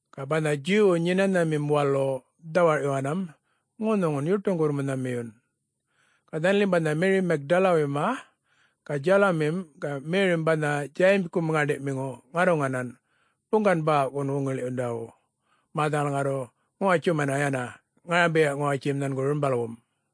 Ga banha Djuwwu Nyenanharamim Walu dhawarꞌyuwanam ŋunhuŋun yuṯuŋgurr-munhamiyun. Ga dhanalim banha Meri Magdalawuyma ga Djalumim ga Merim banha Djayimgum ŋäṉḏiꞌmiŋu ŋarruŋanan buŋgan-bäwꞌwun wuŋiḻiꞌyundawu mä dhanal ŋarru ŋuwatjumana yana ŋarambiya-ŋuwatjim nhangu rumbalwum.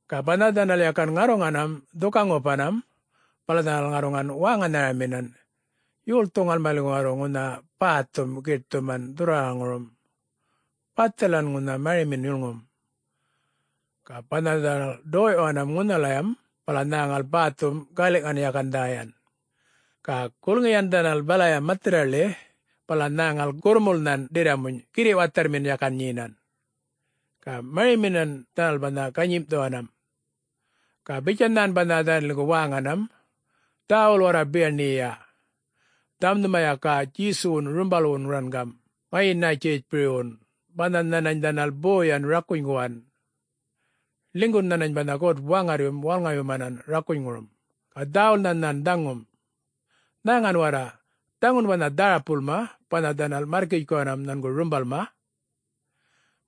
Ga banha dhanal yakan ŋarruŋanam dhuka-ŋupanam, bala dhanal ŋarruŋan wäŋanharaminan, “Yolthu ŋalmaliŋgu ŋarru ŋunha bäthum giṯthuman dhurrwaraŋurum? Bathalan ŋunha marimin yulŋum.” Ga banha dhanal ḏoyꞌyuwan ŋunhalayam, bala nhäŋal bäthum galiꞌŋan yakan dhäyan. Ga gulŋiyan dhanal balaya mathirraḻi bala nhäŋal gurrmulnhan ḏirramuny girriꞌ watharrmin yakan nyenan. Ga mariminan dhanal banha ganyimꞌthuwanam. Ga bitjan nhan banha dhanaliŋgu wäŋanam, “Dhäwul warra biyaṉiyiya. Dhaŋum nhuma yaka Djesuwun rumbalwum rangam ŋayi-Nätjiritjpuywun banha nhanany dhanal boyan rakunyguwan. Ḻinygun nhanany banha God-Waŋarryum wälŋayumanan rakunyŋurum, ga dhäwulnha nhan dhaŋum. Nhäŋan warra, dhaŋun banha dharapulma banha dhanal märrkitjkuwan nhangu rumbalma.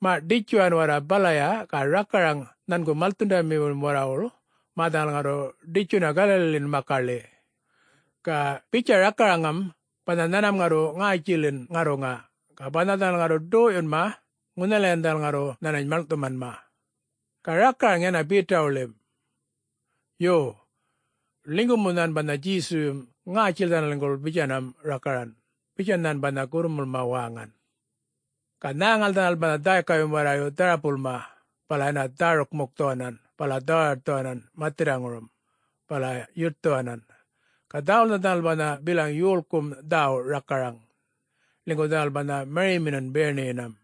Maꞌ ḏitjuwan warra balaya ga rakaraŋ nhangu malthundamiwuḻim warrawuḻ mä dhanal ŋarru ḏitjuna Galaliḻin makaḻi. Ga bitja rakaraŋam banha nhanmam ŋarru ŋätjilin ŋarruŋa, ga banha dhanal ŋarru ḏoyꞌyunma, ŋunhalayan dhanal ŋarru nhanany maḻŋꞌthumanma. Ga rakaraŋ yana Betawuḻim. Yo, ḻinygu mu nhan banha Djesuyum ŋätjil dhanaliŋguḻ bitjanam rakaran,” bitjan nhan banha gurrmulma wäŋan. Ga nhäŋal dhanal banha dhäykayum warrayu dharapulma bala yana dhäruk-mukthuwanan bala dhawaṯthuwanan mathirraŋurum, bala yuṯthuwanan. Ga dhäwulnha dhanal banha bilaŋ yolkum dhäwu rakaran, ḻinygu dhanal banha mariminan biyaṉiyinam.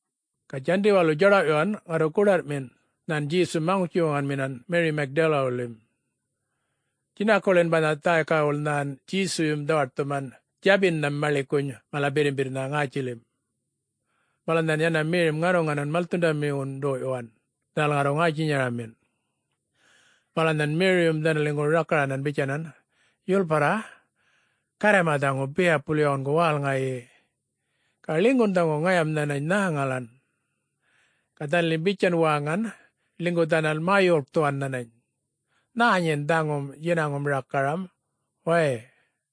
Ga Djandi walu djaḏawꞌyuwan ŋarru goḏarrꞌmin, nhan Djesum maŋutji-wuŋanminan Meri Magdalawuywuḻin. Djinakuḻin banha dhäykawuḻ nhan Djesuyum dhawaṯthuman djabinham maḻikuny mala birrimbirrnha ŋätjilim. Bala nhan yana Merim ŋarruŋanan malthundamiwun ḏoyꞌyuwan, dhanal ŋarruŋan ŋätjinyaramin. Bala nhan Meriyum dhanaliŋgu rakaran bitjanan, “Yulparra, Garrayma dhaŋu biyapul yawungu wälŋayi, ga ḻinygun dhaŋu ŋayam nhanany nhäŋalan.” Ga dhanalim bitjan wäŋan ḻinygu dhanal mä-yuḻkthuwan nhanany, “Nhä nyin dhaŋum djinaŋum rakaram way!’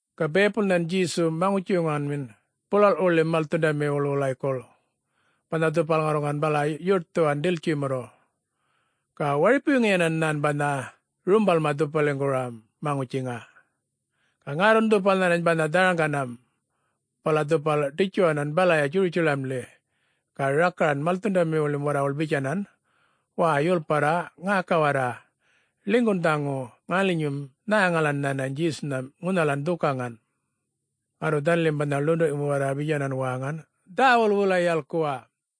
Ga biyapul nhan Djesu maŋutji-wuŋanmin bulalꞌwuḻin malthundamiwuḻ wulaykuḻ, banha dhupal ŋarruŋan bala yuṯthuwan ḏiltjimurru. Ga waripuŋuyinan nhan banha rumbalma dhupaliŋguram maŋutjiŋa. Ga ŋärrun dhupal nhanany banha dharaŋganam. Bala dhupal ḏitjuwanan balaya Djurutjalamḻi ga rakaran malthundamiwuḻim warrawuḻ bitjanan, “Wäy, yulparra ŋäka warra, ḻinygun dhaŋu ŋalinyum nhäŋalan nhanany Djesunham ŋunhalan dhukaŋan!” Ŋarru dhanalim banha ḻunduꞌmiŋum warra bitjanan wäŋan, “Dhäwul wulay yalkuwa.”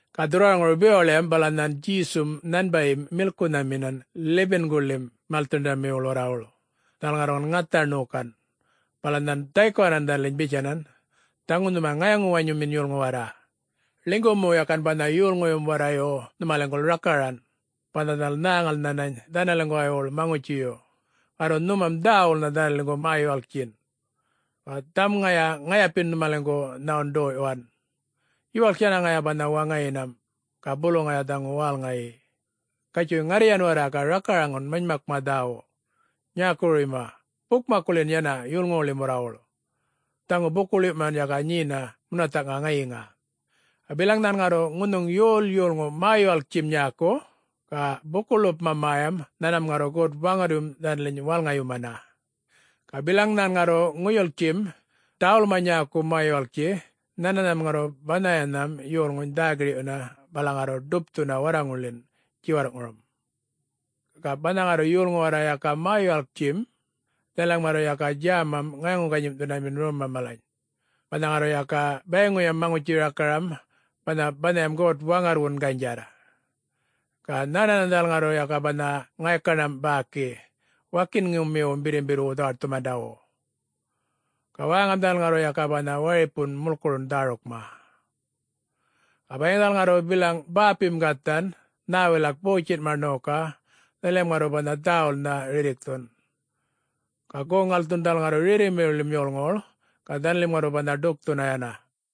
Ga dhurrwaraŋuru bewaḻiyam bala nhan Djesum nhanbayim milkunhaminan 11-guḻin malthundamiwuḻ warrawuḻ, dhanal ŋarruŋan ŋatha ṉokan. Bala nhan dhaykuwanan dhanaliny bitjanan, “Dhaŋu nhuma ŋayaŋu-wanyumin yolŋu warra. Ḻinygu mu yakan banha yolŋuyum warrayu nhumaliŋguḻ rakaran, banha dhanal nhäŋal nhänany dhanaliŋguwaywuḻ maŋutjiyu, ŋarru nhumam dhäwulnha dhanaliŋgu mä-yuwalktjin. Ga dhaŋum ŋaya ŋayapin nhumaliŋgu nhawun ḏoyꞌyuwan. Yuwalk yana ŋaya banha waŋayinam, ga bulu ŋaya dhaŋu wälŋayi. Gatjuy ŋarryan warra ga rakaraŋan manymakma dhäwu nyäkuwuruyma bukmakkuḻin yana yolŋuwuḻim warrawuḻ, dhaŋu buku-ḻiwꞌyuman yaka nyena munathaꞌŋa ŋayiŋa. Ga bilaŋ nhan ŋarru ŋunhuŋ yol yolŋu mä-yuwalktjim nyäku, ga buku-ḻupma mäyam, nhanmam ŋarru God-Waŋarryum dhanaliny wälŋayumana. Ga bilaŋ nhan ŋarru ŋuyulktjim, dhäwulma nyäku mä-yuwalktji nhananham ŋarru banhayam yolŋuny dhä-girꞌyuna bala ŋarru ḏupthuna warraŋulḻin djiwarrꞌŋurum. Ga banha ŋarru yolŋu warra yaka mä-yuwalktjim, dhanalim ŋarru yaka djämam ŋayaŋu-ganyimꞌthundamin romma malany, banha ŋarru yaka bayiŋuyam maŋutji rakaram banha banhayam God-Waŋarrwun ganydjarr. Ga nhänhanan dhanal ŋarru yaka banha ŋaykaṉam bäki wakinŋumiwum birrimbirrwu dhawaṯthumandawu. Ga wäŋam dhanal ŋarru yaka banha waripun mulkurun dhärukma. Ga bayiŋ dhanal ŋarru bilaŋ bäpim gathan, nhä wilak botjinma ṉoka, dhanalim ŋarru banha dhäwulnha rirrikthun. Ga goŋ-ŋalthun dhanal ŋarru rerrimiwuḻim yolŋuwuḻ, ga dhanalim ŋarru banha ḏukthuna yana.”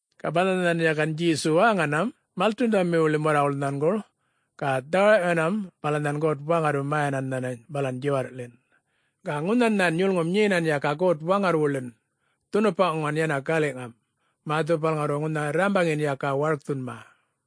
Ga banha nhan yakan Djesu wäŋanam malthundamiwuḻim warrawuḻ nhanguḻ, ga dhawarꞌyuwanam, bala nhan God-Waŋarryum mäyanan nhanany balan djiwarrꞌḻin. Ga ŋunhan nhan yulŋum nyenan yaka God-Waŋarrwuḻin dhunupaŋan yana galiꞌŋam, mä dhupal ŋarru ŋunha rrambaŋin yaka warkthunma.